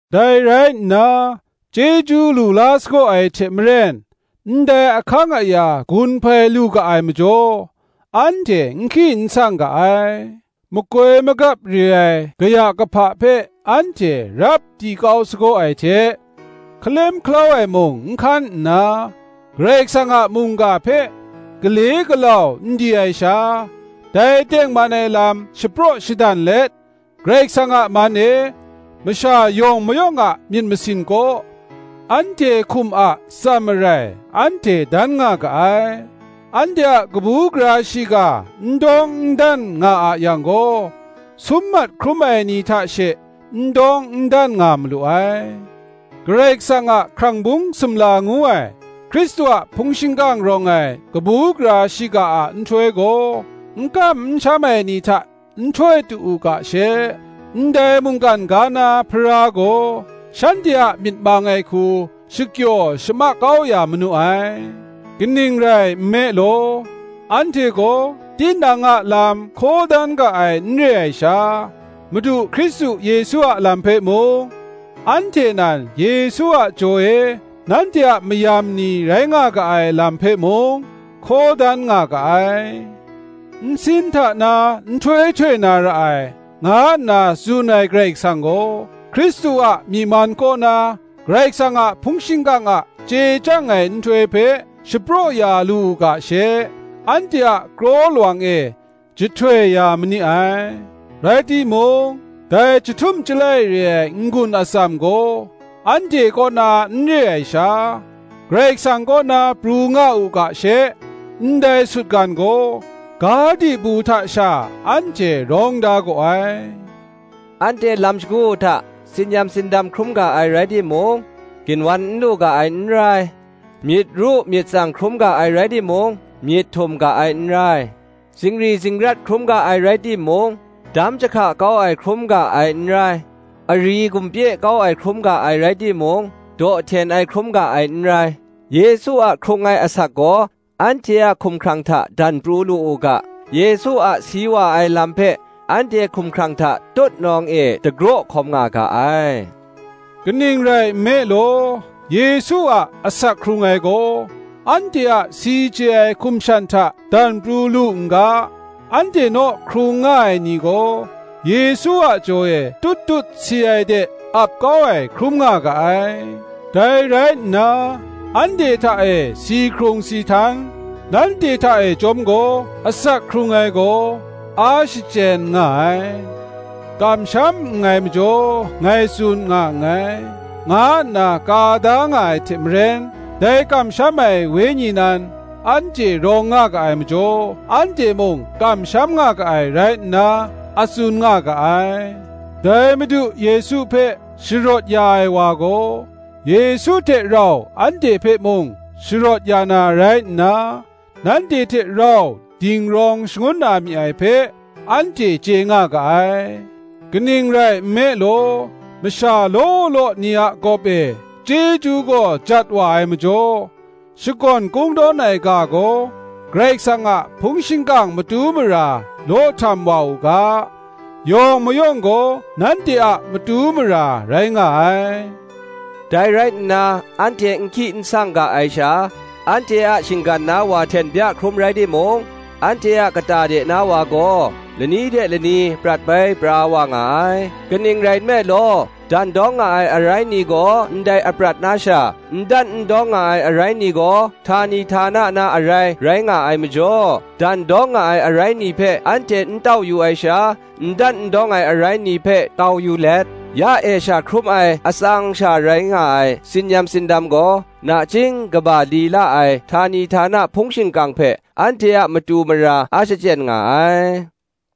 Dai rai nna, chyeju lu la sagaw ai hte maren, ndai ahkang aya gun hpai lu ga ai majaw, anhte n hki n sang ga ai: makoi magap re ai kaya kahpa hpe anhte rap di kau sagaw ai hte, hkalem hkalau ai mung n hkan nna, Karai Kasang a mungga hpe gale galau n di ai sha, dai tengman ai lam shapraw shadan let, Karai Kasang a man e, masha yawng mayawng a myit masin kaw, anhte hkum a atsam marai anhte dan nga ga ai. Anhte a kabu gara shiga n dan n dawng nga a yang gaw, sum mat hkrum ai ni hta she n dan n dawng nga malu ai; Karai Kasang a hkrang bung sumla ngu ai, Hkristu a hpung shingkang rawng ai kabu gara shiga a nhtoi gaw, n kam n sham ai ni hta n htoi tu u ga she, ndai mungkan ga na Hpara gaw, shanhte a myit mang ai hku shakyaw shamak kau ya manu ai. Kaning rai nme law, anhte gaw tinang a lam hkaw dan ga ai n re ai sha, Madu Hkristu Yesu a lam hpe mung, anhte nan Yesu a jaw e nanhte a mayam ni rai nga ga ai lam hpe mung, hkaw dan nga ga ai. Nsin hta na nhtoi htoi na ra ai, nga nna tsun ai Karai Kasang gaw, Hkristu a myi man kaw na Karai kasang a hpung shingkang a chye chyang ai nhtoi hpe shapraw ya lu u ga she, anhte a kraw lawang e jahtoi ya ma ni ai. Rai timung, dai chyahtum chyalai re ai n-gun atsam gaw anhte kaw na n re ai sha, Karai Kasang kaw na pru nga u ga she, ndai sutgan gaw, ga dibu hta sha anhte rawng da gaw ai. Anhte lam shagu hta tsin-yam tsindam hkrum ga ai rai timung, ginwan n lu ga ai n rai; myit ru myit tsang hkrum ga ai rai timung, myit htum ga ai n rai; zungri zingrat hkrum ga ai rai timung, dam jahka kau ai hkrum ga ai n rai; ari gumpye kau ai hkrum ga ai rai timung, daw hten ai hkrum ga ai n rai. Yesu a hkrung ai asak gaw anhte a hkumhkrang hta dan pru lu u ga, Yesu a si wa ai lam hpe anhte hkumhkrang hta tutnawng e dagraw hkawm nga ga ai. Kaning rai nme law, Yesu a asak hkrung ai gaw anhte a si chye ai hkum shan hta dan pru lu n ga, anhte naw hkrung nga ai ni gaw, Yesu a jaw e tut tut si ai de ap kau ai hkrum nga ga ai. Dai rai nna, anhte hta e si hkrung si htan, nanhte hta e chyawm gaw asak hkrung ai gaw, a shachyen nga ai. Kamsham nngai majaw ngai tsun nga nngai, nga nna ka da nga ai hte maren, dai kamsham ai Wenyi nan anhte rawng nga ga ai majaw, anhte mung kamsham nga ga ai rai nna a tsun nga ga ai; dai Madu Yesu hpe sharawt ya ai wa gaw, Yesu hte rau anhte hpe mung sharawt ya na rai nna, nanhte hte rau dingrawng shangun na mi ai hpe, anhte chye nga ga ai. Kaning rai nme law, masha law law ni a gawp e chyeju gaw jat wa ai majaw, shakawn kungdawn ai ga gaw Karai Kasang a hpung shingkang matu mara law htam wa u ga, yawng mayawng gaw nanhte a matu mara rai nga ai. Dai rai nna anhte n hki n sang ga ai sha, anhte a shinggan na wa hten bya hkrum rai timung, anhte a kata de na wa gaw, lani hte lani prat bai pra wa nga ai. Kaning rai nme law, dandawng nga ai arai ni gaw ndai aprat na sha, n dan n dawng nga ai arai ni gaw htani htana na arai rai nga ai majaw, dandawng nga ai arai ni hpe anhte n tau yu ai sha, n dan n dawng ai arai ni hpe tau yu let, ya e sha hkrum ai atsang sha rai nga ai tsin-yam tsindam gaw, nachying kaba li la ai htani htana hpung shingkang hpe anhte a matu mara a shachyen nga ai.